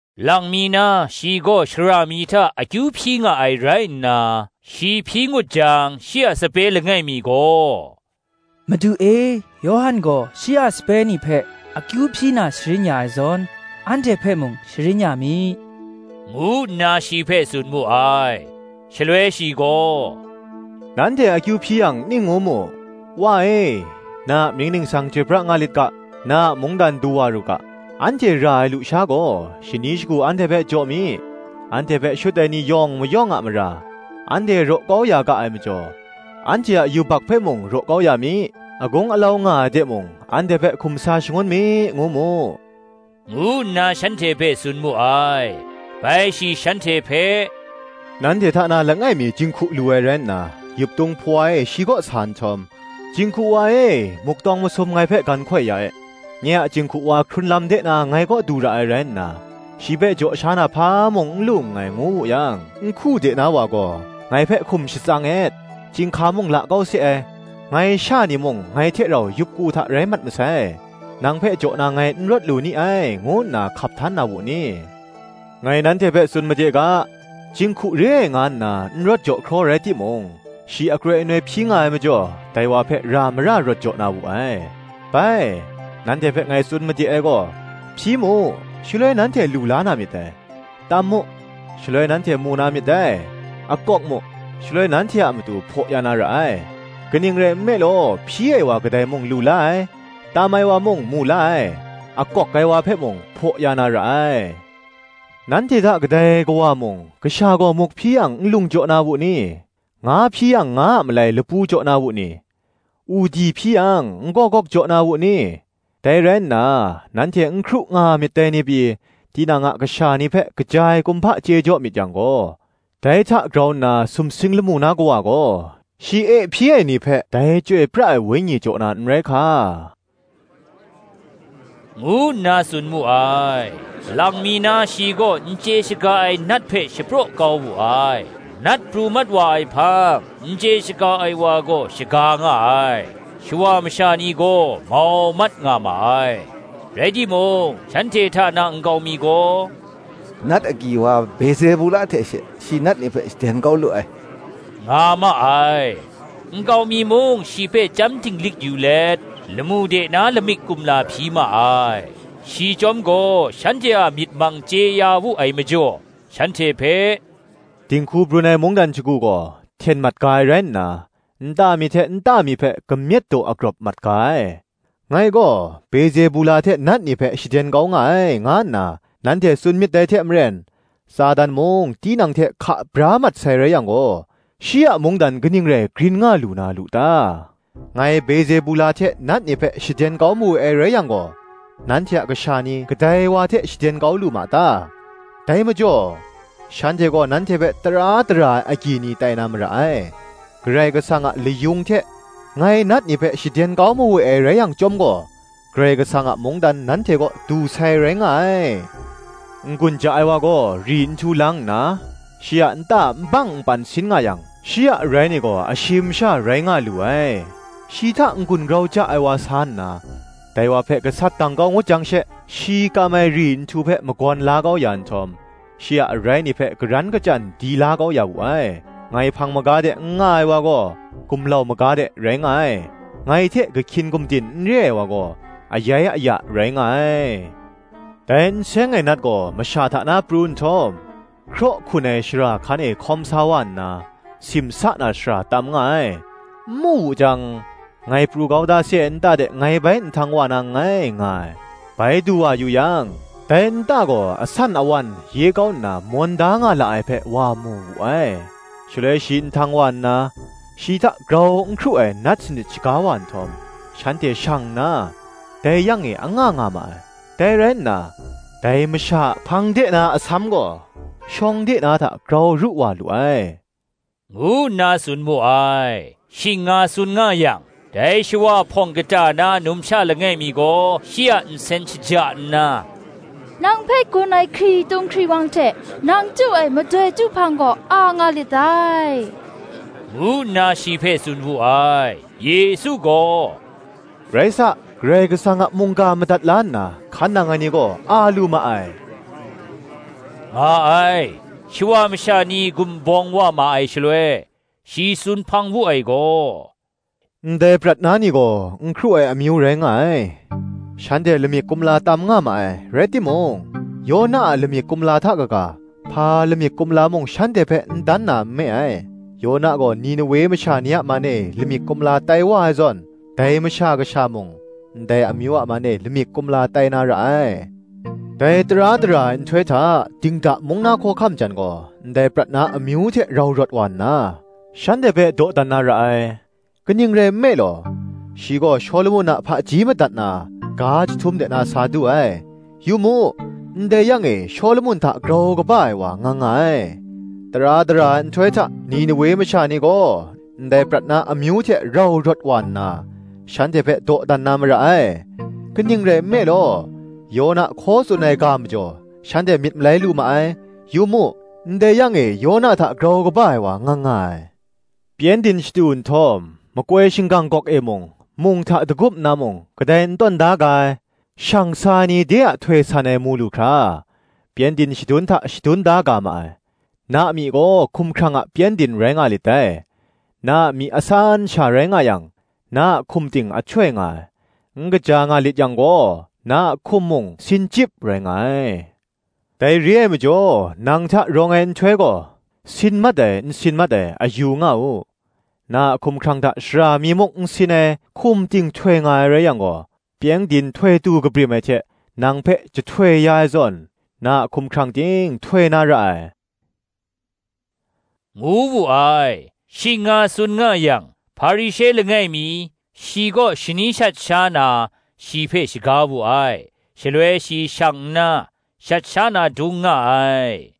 Lang mi na shi gaw shara mi hta akyu hpyi nga ai rai nna, shi hpyi ngut jang, shi a sape langai mi gaw, “Madu e, Yawhan gaw shi a sape ni hpe akyu hpyi na sharin ya ai zawn, anhte hpe mung sharin ya mi,” ngu nna shi hpe tsun mu ai. Shaloi shi gaw, “Nanhte akyu hpyi yang ning ngu mu: ‘Wa e, Na a mying ningsang chyoi pra nga lit ga; Na a mungdan du wa ru ga. Anhte ra ai lusha gaw, shani shagu anhte hpe jaw mi. Anhte hpe shut ai ni yawng mayawng a mara, anhte raw kau ya ga ai majaw, anhte a yubak hpe mung raw kau ya mi. Agung alau nga ai de mung anhte hpe hkum sa shangun mi,’ ngu mu,” ngu nna shanhte hpe tsun mu ai. Bai shi shanhte hpe, Nanhte hta na langai mi jinghku lu ai rai nna, yuptung hpawa e shi kaw sa nhtawm, “Jinghku wa e, muk tawng masum ngai hpe gan hkoi ya e; nye a jinghku wa hkrun lam de na ngai kaw du ra ai rai nna, shi hpe jaw sha na hpa mung n lu nngai,” ngu wu yang, nhku de na wa gaw, “Ngai hpe hkum shatsang et; chyinghka mung la kau se ai, ngai sha ni mung ngai hte rau yup ku hta rai mat masai: nang hpe jaw na ngai n rawt lu ni ai, ngu nna hkap htan na wu ni? Ngai nanhte hpe tsun made ga, jinghku re ai nga nna n rawt jaw hkraw rai timung, shi akroi anoi hpyi nga ai majaw, dai wa hpe ra mara rawt jaw na wu ai. Bai, nanhte hpe ngai tsun made ai gaw, Hpyi mu, shaloi nanhte lu la na myit dai; tam mu, shaloi nanhte mu na myit dai; akawk mu, shaloi nanhte a matu hpaw ya na ra ai. Kaning rai nme law, hpyi ai wa kadai mung lu la ai; tam ai wa mung mu la ai, akawk ai wa hpe mung hpaw ya na ra ai. Nanhte hta kadai kawa mung, kasha gaw muk hpyi yang, nlung jaw na wu ni? nga hpyi yang, nga a malai lapu jaw na wu ni? udi hpyi yang, n-gawgawk jaw na wu ni? Dai rai nna, nanhte n hkru nga myit dai ni pyi, tinang a kasha ni hpe kaja ai kumhpa chye jaw myit yang gaw, dai hta grau nna sumsing lamu na Kawa gaw, shi e hpyi ai ni hpe dai Chyoi pra ai Wenyi jaw na n rai hka!” ngu nna tsun mu ai. Lang mi na shi gaw n chye shaga ai nat hpe shapraw kau wu ai: nat pru mat wa ai hpang, n chye shaga ai wa gaw shaga nga ai. Shawa masha ni gaw mau mat nga ma ai. Rai timung, shanhte hta na nkau mi gaw, “Nat agyi wa Bezebula hte she, shi nat ni hpe shaden kau lu ai,” nga ma ai. Nkau mi mung shi hpe chyam dinglik yu let, lamu de na lamik kumla hpyi ma ai. Shi chyawm gaw shanhte a myit mang chye ya wu ai majaw, shanhte hpe, “Dinghku brun ai mungdan shagu gaw, hten mat ga ai rai nna, nta mi hte nta mi hpe kamyet daw agrawp mat ga ai. Ngai gaw Bezebula hte nat ni hpe shaden kau nga ai, nga nna nanhte tsun myit dai hte maren, Satan mung tinang hte hka bra mat sai rai yang gaw, shi a mungdan kaning rai grin nga lu na lu ta? Ngai Bezebula hte nat ni hpe shaden kau mawe ai rai yang gaw, nanhte a kasha ni kadai wa hte shaden kau nga ma ta? dai majaw, shanhte gaw nanhte hpe tara dara ai agyi ni tai na mara ai. Karai Kasang a layung hte ngai nat ni hpe shaden kau mawe ai rai yang chyawm gaw, Karai Kasang a mungdan nanhte kaw du sai rai nga ai. N-gun ja ai wa gaw ri nhtu lang nna, shi a nta nbang npan sin nga yang, shi a arai ni gaw ashim sha rai nga lu ai: shi hta n-gun grau ja ai wa sa nna, dai wa hpe gasat dang kau ngut jang she, shi kam ai ri nhtu hpe magawn la kau ya nhtawm, shi a arai ni hpe karan kachyan di la kau ya wu ai. Ngai hpang maga de n nga ai wa gaw, gumlau maga de rai nga ai: ngai hte kahkyin gumdin n re ai wa gaw, ayai aya rai nga ai. Dai n seng ai nat gaw masha hta na pru nhtawm, hkraw hkun ai shara hkan e hkawm sa wa nna, simsa na shara tam nga ai; n mu wu jang, Ngai pru kau da se ai nta de ngai bai nhtang wa na nngai, nga ai. Bai du wa yu yang, dai nta gaw asan awan, ye kau nna mawn da nga la ai hpe, wa mu wu ai. Shaloi shi nhtang sa nna, shi hta grau n hkru ai nat sanit shaga wa nhtawm, shanhte shang nna, dai yang e anga nga ma ai: dai rai nna, dai masha a hpang de na asam gaw shawng de na hta grau ru wa lu ai,” ngu nna tsun mu ai. Shing nga tsun nga yang, dai shawa hpawng kata na numsha langai mi gaw shi a nsen shaja nna, “Nang hpe gun ai hkritung hkriwang hte, nang chyu ai madoi chyu hpang gaw, a nga lit dai,” ngu nna shi hpe tsun wu ai. Yesu gaw, “Rai sa, Karai Kasang a mungga madat la nna, hkan nang ai ni gaw a lu ma ai,” nga ai. Shawa masha ni gumbawm wa ma ai shaloi, shi tsun hpang wu ai gaw, “Ndai prat na ni gaw n hkru ai amyu rai nga ai: shanhte lamik kumla tam nga ma ai; rai timung, Yona a lamik kumla hta kaga, hpa lamik kumla mung shanhte hpe n dan na nme ai. Yona gaw Ninewe masha ni a man e lamik kumla tai wa ai zawn, dai Masha Kasha mung, ndai amyu a man e, lamik kumla tai na ra ai. Dai tara dara ai nhtoi hta, dingda mung na hkawhkam jan gaw, ndai prat na amyu hte rau rawt wa nna, shanhte hpe dawdan na ra ai: kaning rai nme law, shi gaw Shawlumon a hpaji madat na, ga jahtum de na sa du ai: yu mu, ndai yang e Shawlumon hta grau kaba ai wa nga nga ai. Tara dara ai nhtoi hta Ninewe masha ni gaw, ndai prat na amyu hte rau rawt wa nna, shanhte hpe dawdan na mara ai; kaning rai nme law, Yona hkaw tsun ai ga majaw, shanhte myit malai lu ma ai: yu mu, ndai yang e Yona hta grau kaba ai wa nga nga ai. Pyengdin shatu nhtawm, makoi shinggang gawk e mung, mung hte dagup nna mung, kadai n tawn da ga ai: shang sa ai ni de a htoi san ai mu lu hkra, pyengdin shadun hta shadun da ga ma ai. Na myi gaw hkumhkrang a pyengdin rai nga lit dai; na a myi asan sha rai nga yang, na a hkum ting ahtoi nga ai: n kaja nga lit yang gaw, na a hkum mung sin chyip rai nga ai. Dai re ai majaw, nang hta rawng ai ahtoi gaw, sin mat ai n sin mat ai, a yu nga u. Na a hkumhkrang hta shara mi muk n sin ai, hkum ting htoi nga ai rai yang gaw, pyengdin htoi tu kabrim ai hte nang hpe jahtoi ya ai zawn, na a hkumhkrang ting htoi na ra ai, ngu wu ai. Shing nga tsun nga yang, Hparishe langai mi, shi kaw shani shat sha na, shi hpe shaga wu ai: shaloi shi shang nna, shat sha na dung nga ai.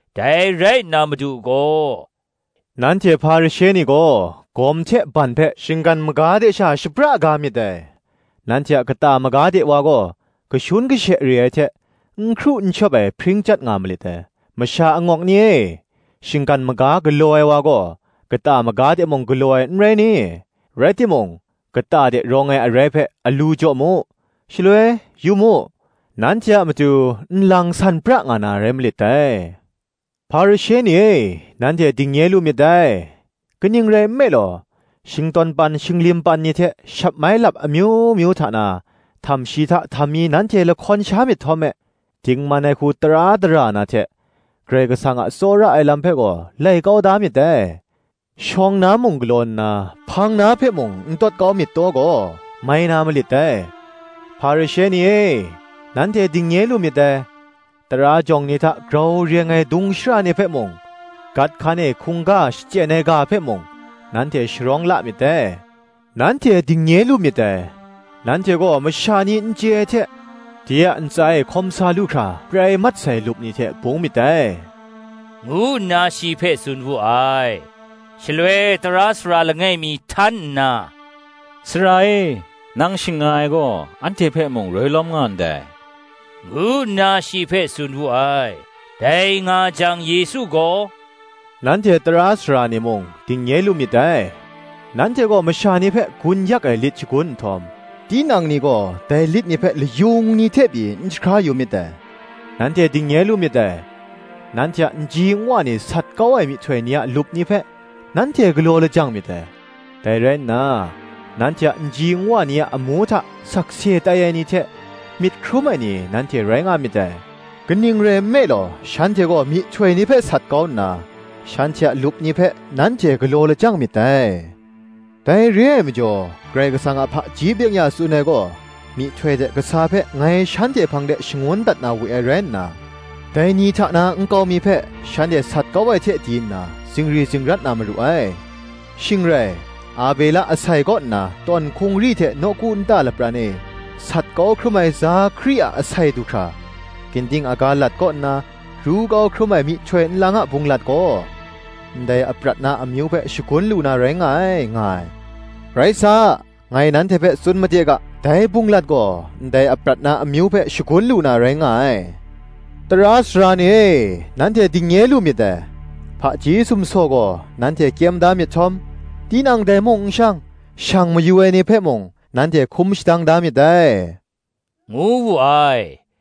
Dai rai nna Madu gaw, “Nanhte Hparishe ni gaw, gawm hte ban hpe shinggan maga de sha shapra ga myit dai; nanhte a kata maga de wa gaw, kashun kashe re ai hte, n hkru n shawp ai hpring chyat nga malit dai. Masha angawk ni e, shinggan maga galaw ai wa gaw, kata maga de mung galaw ai, n rai ni? Rai timung, kata de rawng ai arai hpe alu jaw mu; shaloi, yu mu, nanhte a matu nlang san pra nga na rai malit dai. Hparishe ni e, nanhte dingnye lu myit dai! kaning rai nme law, shingtawn pan, shinglim pan ni hte shat mai lap amyu myu hta na, htamshi hta htammi nanhte lahkawn sha myit htawm me, dingman ai hku tara dara na hte, Karai Kasang a tsawra ai lam hpe gaw, lai kau da myit dai: shawng na mung galaw nna, hpang na hpe mung n tawt kau myit taw gaw, mai na malit dai. Hparishe ni e, nanhte dingnye lu myit dai! tara jawng ni hta grau reng ai dung shara ni hpe mung, gat hkan e hkungga shachyen ai ga hpe mung, nanhte sharawng la myit dai. Nanhte dingnye lu myit dai! nanhte gaw masha ni n chye ai hte, de a ntsa e hkawm sa lu hkra prai mat sai lup ni hte bung myit dai,” ngu nna shi hpe tsun wu ai. Shaloi tara sara langai mi htan nna, “Sara e, nang shing nga ai gaw, anhte hpe mung roi lawm nga ndai,” ngu nna shi hpe tsun wu ai. Dai nga jang Yesu gaw, “Nanhte tara sara ni mung dingnye lu myit dai! nanhte gaw masha ni hpe gun yak ai lit shagun nhtawm, tinang ni gaw dai lit ni hpe layung mi hte pyi n jahkra yu myit dai. Nanhte dingnye lu myit dai! Nanhte a nji nwa ni sat kau ai myihtoi ni a lup ni hpe nanhte galaw lajang myit dai: dai rai nna nanhte a nji nwa ni a amu hta sakse tai ai ni hte, myit hkrum ai ni nanhte rai nga myit dai: kaning rai nme law, shanhte gaw myihtoi ni hpe sat kau nna, shanhte a lup ni hpe nanhte galaw lajang myit dai. Dai re ai majaw, Karai Kasang a hpaji byeng-ya tsun ai gaw, Myihtoi hte kasa hpe ngai shanhte hpang de shangun dat na we ai rai nna, dai ni hta na nkau mi hpe shanhte sat kau ai hte di nna, zingri zingrat na maru ai: shing rai, Abela asai kaw nna, tawn hkungri hte nawku nta lapran e sat kau hkrum ai Zakari a asai du hkra, ginding aga lat kaw nna ru kau hkrum ai myihtoi nlang a bunglat gaw, ndai aprat na amyu hpe shagun lu na rai nga ai, nga ai; rai sa, ngai nanhte hpe tsun made ga, dai bunglat gaw ndai aprat na amyu hpe shagun lu na rai nga ai. Tara sara ni e, nanhte dingnye lu myit dai! hpaji sumsaw gaw nanhte kyem da myit htawm, tinang dai mung n shang, shang mayu ai ni hpe mung, nanhte hkum shadang da myit dai,” ngu wu ai.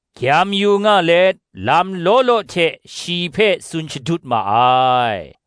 gyam yu nga let, lam law law hte shi hpe tsun shadut ma ai.